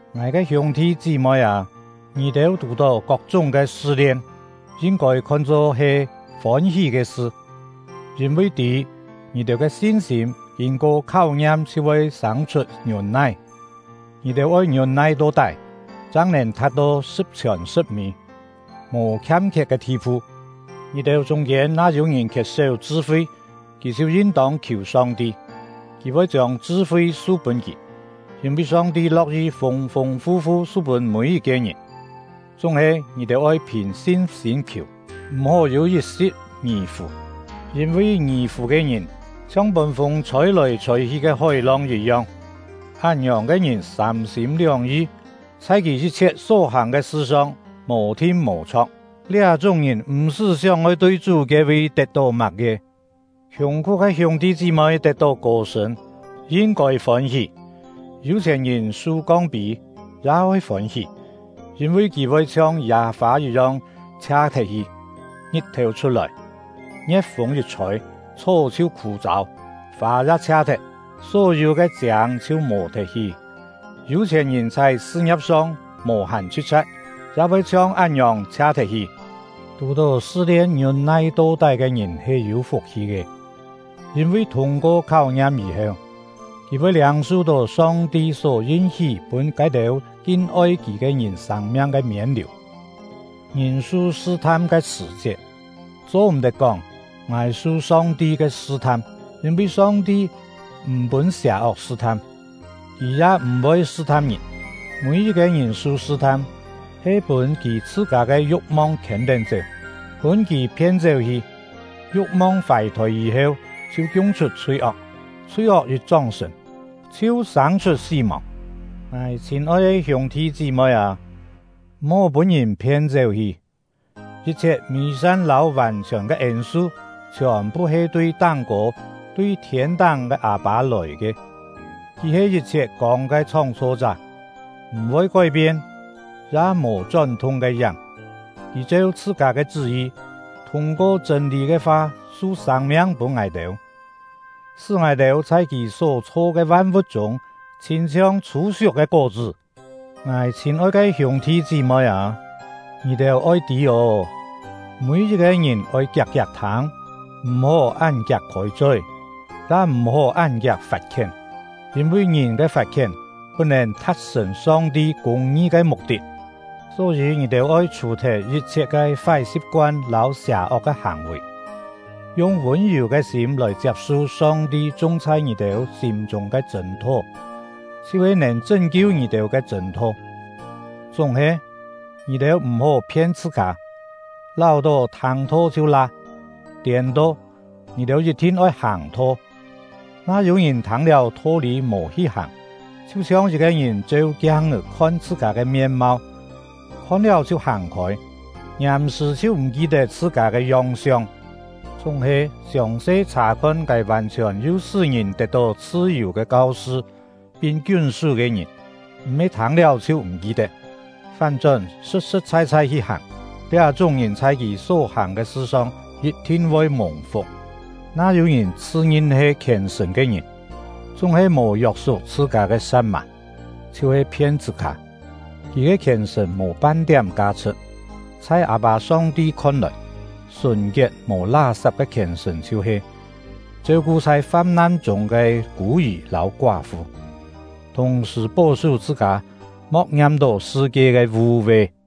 Ngài ke hiûng-thi chí-moi â, ngì-têu tù-tó kok-chúng ke sṳ-lien, yin-kôi khon-cho he fôn-hí ke sṳ, yîn-vi tî, ngì-têu ke sin-sîm kîn-ko kháu-ngiam chhiu voi sâng-chhut ngiûn-nai. Ngì-têu oi ngiûn-nai to-tái, chang nèn tha̍t-to sṳ̍p-chhiòn sṳ̍p-mî, mò khiam-khiet ke thi-phu. Ngì-têu chûng-kiên na yû-ngìn khiet-séu chṳ-fi, kì chhiu yin-tông khiù Song-ti; Kì voi chiông chṳ-fi su-pûn kì, yîn-vi Song-ti lo̍k-yi fûng-fûng fu-fu su-pûn mî-yit-ke ngìn. Chúng-he, ngì-têu oi phìn sin-sîm khiù, m̀-hó yû yit-si̍t ngì-fù; yîn-vi ngì-fù ke ngìn chhiong pûn fûng chhôi-lòi chhôi-hi ke hói-long yit-yong. Án-ngiòng ke ngìn sâm-sîm lióng-yi, chhai kì yit-chhiet só-hàng ke sṳ-song mò-thin mò-chho̍k; liá-chúng ngìn m̀-sṳ́ sióng-oi tui Chú ke-vi tet-tó má-ke. Khiùng-khú ke hiûng-thi chí-moi tet-tó kô-sṳ̂n, yin-kôi fôn-hí; yû-chhièn-ngìn su kong-pî ya oi fôn-hí; yîn-vi kì voi chhiong yâ-fâ yit-yong chhia-thet-hi. Ngit-thèu chhut-lòi, ngie̍t-fûng yit chhôi, chhó chhiu khû-châu, fâ ya chhia-thet, só-yû ke chiâng chhiu mò-thet hi. Yû-chhièn-ngìn chhai sṳ-ngia̍p-song mò-hàn chhṳ̍t-chha̍t, ya voi chhiong án-ngiòng chhia-thet-hi. Tù-tó sṳ-lien ngiûn-nai to-tái ke ngìn he yû fuk-hi ke; yîn-vi thûng-ko kháu-ngiam yî-heu, kì voi liâng-su-tó Song-ti só yin-hí pûn ke-têu kin-oi Kì ke ngìn sâng-miang ke miên-liù. Ngìn su sṳ-tham ke sṳ̀-chiet, cho-m̀-tet kóng: “Ngài he su Song-ti ke sṳ-tham!” Yîn-vi Song-ti m̀ pûn sià-ok sṳ-tham, Kì ya m̀-voi sṳ-tham ngìn. Mî-yit-ke ngìn su sṳ-tham, he pûn kì chhṳ-kâ ke yu̍k-mong khiên-tén-chéu, pûn kì phien-chéu-hi. Yu̍k-mong fài-thôi yî-heu, chhiu kiung-chhut chhui-ok; chhui-ok yit chóng-sṳ̀n, chhiu sâng-chhut sí-mòng. Ngài chhîn-oi ke hiûng-thi chí-moi â, m̀-hó pûn-ngìn phien-chéu-hi! Yit-chhiet mî-san lâu vàn-chhiòn ke ên-su chhiòn-phu he tui táng-kô, tui thiên-táng ke Â-pâ lòi ke; Kì he yit-chhiet kông ke Chhóng-chho-chá, m̀-voi kói-pien, ya mò chón-thung ke yáng. Kì cheu chhṳ-kâ ke chṳ́-yi, thûng-ko chṳ̂n-lî ke fa su sâng-miang pûn ngài-têu, sṳ́ ngài-têu chhai Kì só-chho ke van-vu̍t chûng chhîn-chhiong chhû-siuk ke kó-chṳ́. Ngài chhîn-oi ke hiûng-thi chí-moi â, ngì-têu oi tî ô! Mî-yit-ke ngìn oi kiak-kiak thâng, m̀-hó án kiak khôi-choi, ya m̀-hó án kiak fat-khién; yîn-vi ngìn ke fat-khién put-nèn tha̍t-sṳ̀n Song-ti kûng-ngi ke muk-tit. Só-yî, ngì-têu oi chhù-thet yit-chhiet ke fái si̍p-koan lâu sià-ok ke hàng-vì, yung vûn-yù ke sîm lòi chiap-su Song-ti chung chhai ngì-têu sîm-chûng ke chṳ̂n-tho, chhiu-he nèn chṳ́n-kiu ngì-têu ke chṳ̂n-tho. Chúng-he, ngì-têu m̀-hó phien chhṳ-kâ, láu-tó thâng-tho chhiu la; tiên-to, ngì-têu yit-thin oi hàng-tho. Na yû-ngìn thâng-liáu tho-lî mò hi hàng, chhiu-chhiong yit-ke ngìn cheu kiang-é khon chhṳ-kâ ke mien-mau, khon-liáu chhiu hàng-khôi, ngiàm-sṳ̀ chhiu m̀ ki-tet chhṳ-kâ ke yong-siong. Chúng-he, siòng-se chhà-khon ke vàn-chhiòn yu pûn ngìn tet-tó chhṳ-yù ke kau-sṳ, pin kiún-sú ke ngìn, m̀-he thâng-liáu chhiu m̀ ki-tet, fán-chón sṳ̍t-sṳ̍t chhai-chhai hi hàng, liá-chúng ngìn chhai kì só-hàng ke sṳ-song yit-thin voi mùng-fuk. Na yû-ngìn chhṳ-ngin he khièn-sṳ̀n ke ngìn, chúng-he mò yok-suk chhṳ-kâ ke sa̍t-mà, chhiu-he phien chhṳ-kâ; kì ke khièn-sṳ̀n mò pan-tiám ka-chhṳ̍t. Chhai Â-pâ Song-ti khon-lòi, sùn-kiet mò lá-sap ke khièn-sṳ̀n chhiu-he: Cheu-ku chhai fam-nan chûng ke kû-yì lâu koá-fu; thùng-sṳ̀ pó-sú chhṳ-kâ mo̍k ngiam-tó sṳ-kie ke vû-ve.